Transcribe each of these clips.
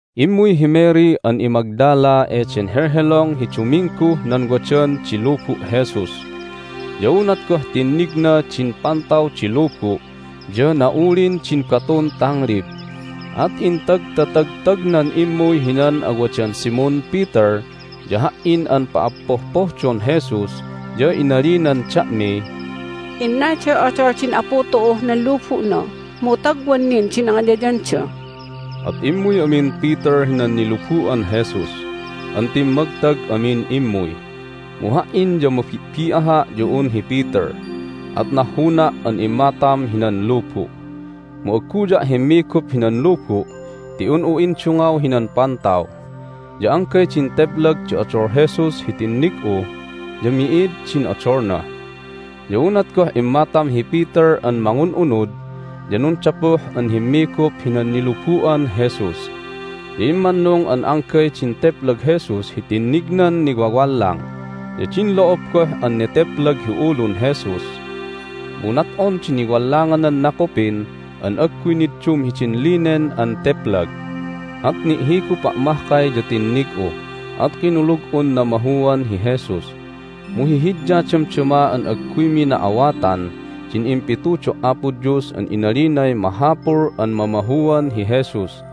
Immuy hi Mary an iMagdala eden helhelong hi Dumingguh nan wadan di lubu' Jesus. Ya unat goh tinnigna din pantaw di lubu' ya na'ulin din batun tanglib. At intagtatagtagnan immuy hinan awadan Simon Peter ya ha"in an pa'appohpohdon Jesus, ya inalinan da'miy, "Innalday odol din Apu tu'uh nan lubu'na, mu tagwan nin di nangiyayanda!" At immuy amin Peter hinan nilubu'an Jesus an timmagtag amin immuy, mu ha"in ya mabi'bi'aha' ya un hi Peter, at nahhuna' an immatam hinan lubu'. Mu agguya' himmigup hinan lubu' ti un'u indungaw hinan pantaw, ya anggay din teplag di odol Jesus hi tinnig'u, ya mi'id din odolna. Ya unat goh immatam hi Peter an mangun'unud ya nundapuh an himmigup hinan nilubu'an Jesus. Ya immannung an anggay din teplag Jesus hi tinnignan niwawallang, ya din lo'ob goh an neteplag hi ulun Jesus. Mu nat'on di niwallanganan nakupin an agguy niddum hidin linen an teplag. At ni'higupa' mahkay ya tinnig'u, at kinulug'un namahuan hi Jesus. Mu hihidya damdama an agguymi na'awatan din impitudo' Apo Dios an inalinay mahapul an mamahuan hi Jesus.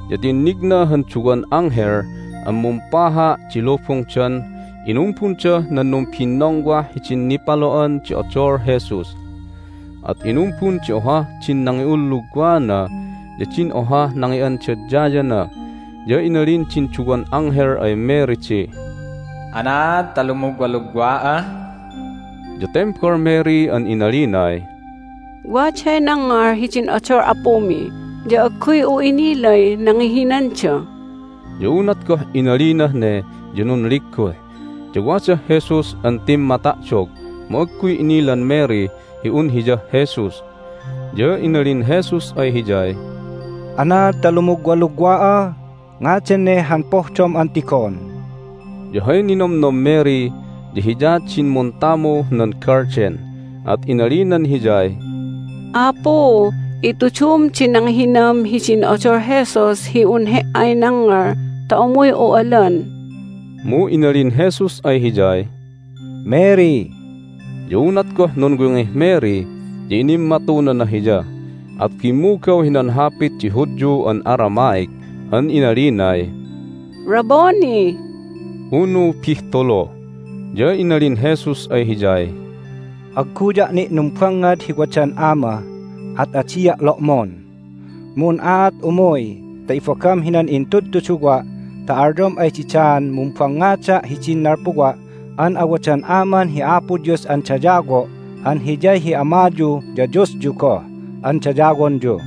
ya tinnigna han duwan anghel an mumpaha' di lubungdan inumbundah nan numbinnongwah hidin nipalo'an di odol Jesus. At inumbun di ohah din nangi'ulluwana ya din ohah nangi'andadyana. Ya inalin din duwan anghel ay Mary di, "Anaad ta lumugwalugwa'a?" Ya tembal Mary an inalinay, "Waday nangngal hidin odol Apumi, ya agguy'u innilay nangihinanda!" Ya unat goh inalinah ne ya nunligguh, ya wadah Jesus an timmata'dog, mu agguy inilan Mary hi un Hiyah Jesus. Ya inalin Jesus ay hiyay, "Anaad ta lumugwalugwa'a? Ngadan ne han pohdom an tigon?" Ya hay ninomnom Mary ya Hiya din muntamuh nan galden, at inalinan Hiyay, "Apu, itudum di nangihinam hidin odol Jesus hi un He"ay nangngal ta umuy'u alan!" Mu inalin Jesus ay hiyay, "Mary!" Ya unat goh nunwingih Mary ya inimmatunana Hiya, at bimmugaw hinan hapit di Hudyu an Aramaic, an inalinay, "Rabboni!" (unu Bihtulu!). Ya inalin Jesus ay hiyay, "Agguya' ni' numbangngad hi wadan Ama, at adia' lo'mon. Mu un'aat umuy ta ibagam hinan intudtuduwa' ta alyom ay didaan mumbangngada' hidin nalpuwa' an awadan Aman hi Apo Dios an dayawo' an Hiyay hi Amayu ya Diosyu goh an dayawonyu."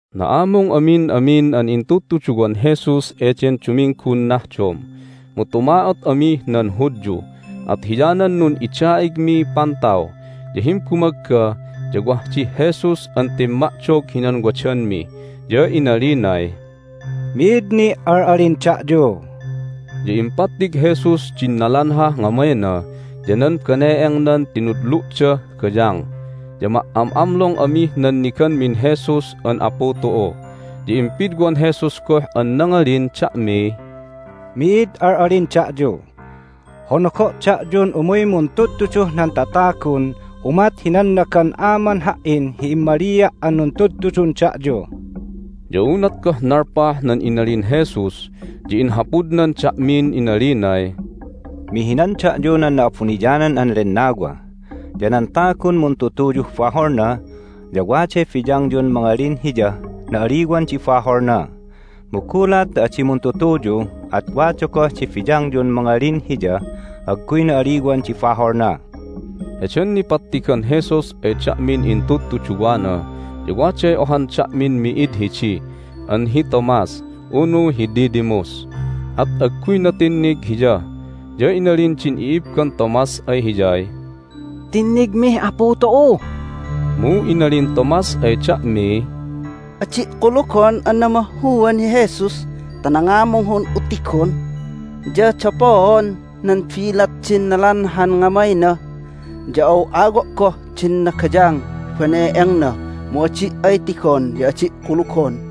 Na'amung amin amin an intudtuduwan Jesus eden Duminggun nahdom, mu tuma'ot amih nan Hudyu, at hiyanan nun'ida'igmiy pantaw. Ya himbumagga ya wah dih Jesus an timma'dog hinan wadanmi, ya inalinay, "Mi'id ni' al'alin da'yu!" Ya impattig Jesus din nalanhah ngamayna ya nan bane'engnan tinudlu'dah gayang. Ya ma"am'amlong amih nanniganmin Jesus an Apu tu'u. Ya impidwan Jesus goh an nangalin da'miy, "Mi'id al'alin da'yu! Honogo' da'yun umuy muntudtuduh nan tatagun umat hi nannagan Aman Ha"in hi immalia' an nuntudtudun da'yu." Ya unat goh nalpah nan inalin Jesus ya inhapudnan da'min inalinay, "Mihinan da'yu nan Na'abuniyanan an Lennawa. Ya nan tagun muntutuyuh baholna ya waday biyangyun mangalin hiyah na'aliwan di baholna. Mu gulat ta adi muntutuyu at wada goh di biyangyun mangalin hiyah agguy na'aliwan di baholna." Heden nipattigan Jesus ay da'min intudtuduwana ya waday ohan da'min mi'id hidi an hi Thomas (unu hi Didymus), at agguyna tinnig Hiya. Ya inalin din i'ibban Thomas ay hiyay, "Tinnigmih Apu tu'u!" Mu inalin Thomas ay da'miy, "Adi' kulugon an namahuan hi Jesus ta nangamung hi un'u tigon ya dapoon nan bilat din nalanhan ngamayna, ya aw'awo' goh din nagayang hi bane'engna. Mu adi' ay tigon ya adi' kulugon!"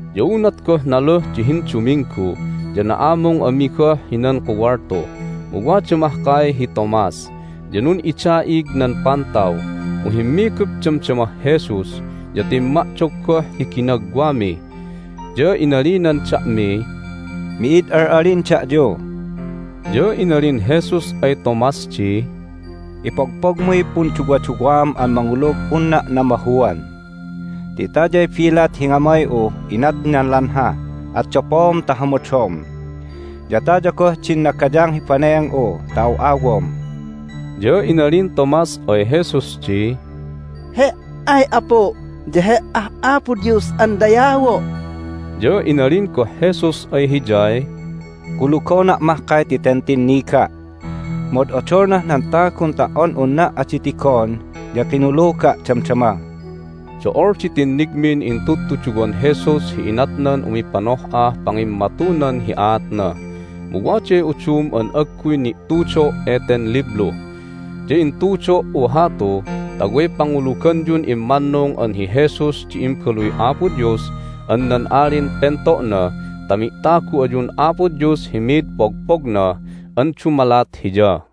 Ya unat goh naluh di hinduminggu ya na'amung ami goh hinan kuwaltu, mu wada mahkay hi Thomas. Ya nun'ida'ig nan pantaw, mu himmigup damdamah Jesus, ya timma'dog goh hi ginagwami, ya inalinan da'miy, "Mi'id al'alin da'yu!" Ya inalin Jesus ay Thomas di, "Ipogpogmuy punduwaduwaam an mangulug unna' namahuan! Ti tayay bilat hi ngamay'uh inat nan lanha, at dapoom ta hamadom. Ya taya goh din nagayang hi bane'eng'u ta aw'awom." Ya inalin Thomas ay Jesus di, "He"ay Apu', ya He"ah Apo Dios an dayawo'!" Ya inalin goh Jesus ay hiyay, "Kulugona' mahkay ti ten tinniga'. Mu od'odolnah nan tagun ta"on unna' adi tigon ya kinuluga' damdama!" Do'ol di tinnigmin intudtuduwan Jesus hi inatnan umipanoh'ah pangimmatunan hi aatna, mu waday udum an agguy ni'tudo' eten liblu. Ya intudo"u hatu ta way panguluganyun immannung an hi Jesus di Imbaluy Apo Dios an nan Alin Pento'na ta mi'tagu ayun Apo Dios hi mid pogpogna an dumalat Hiya.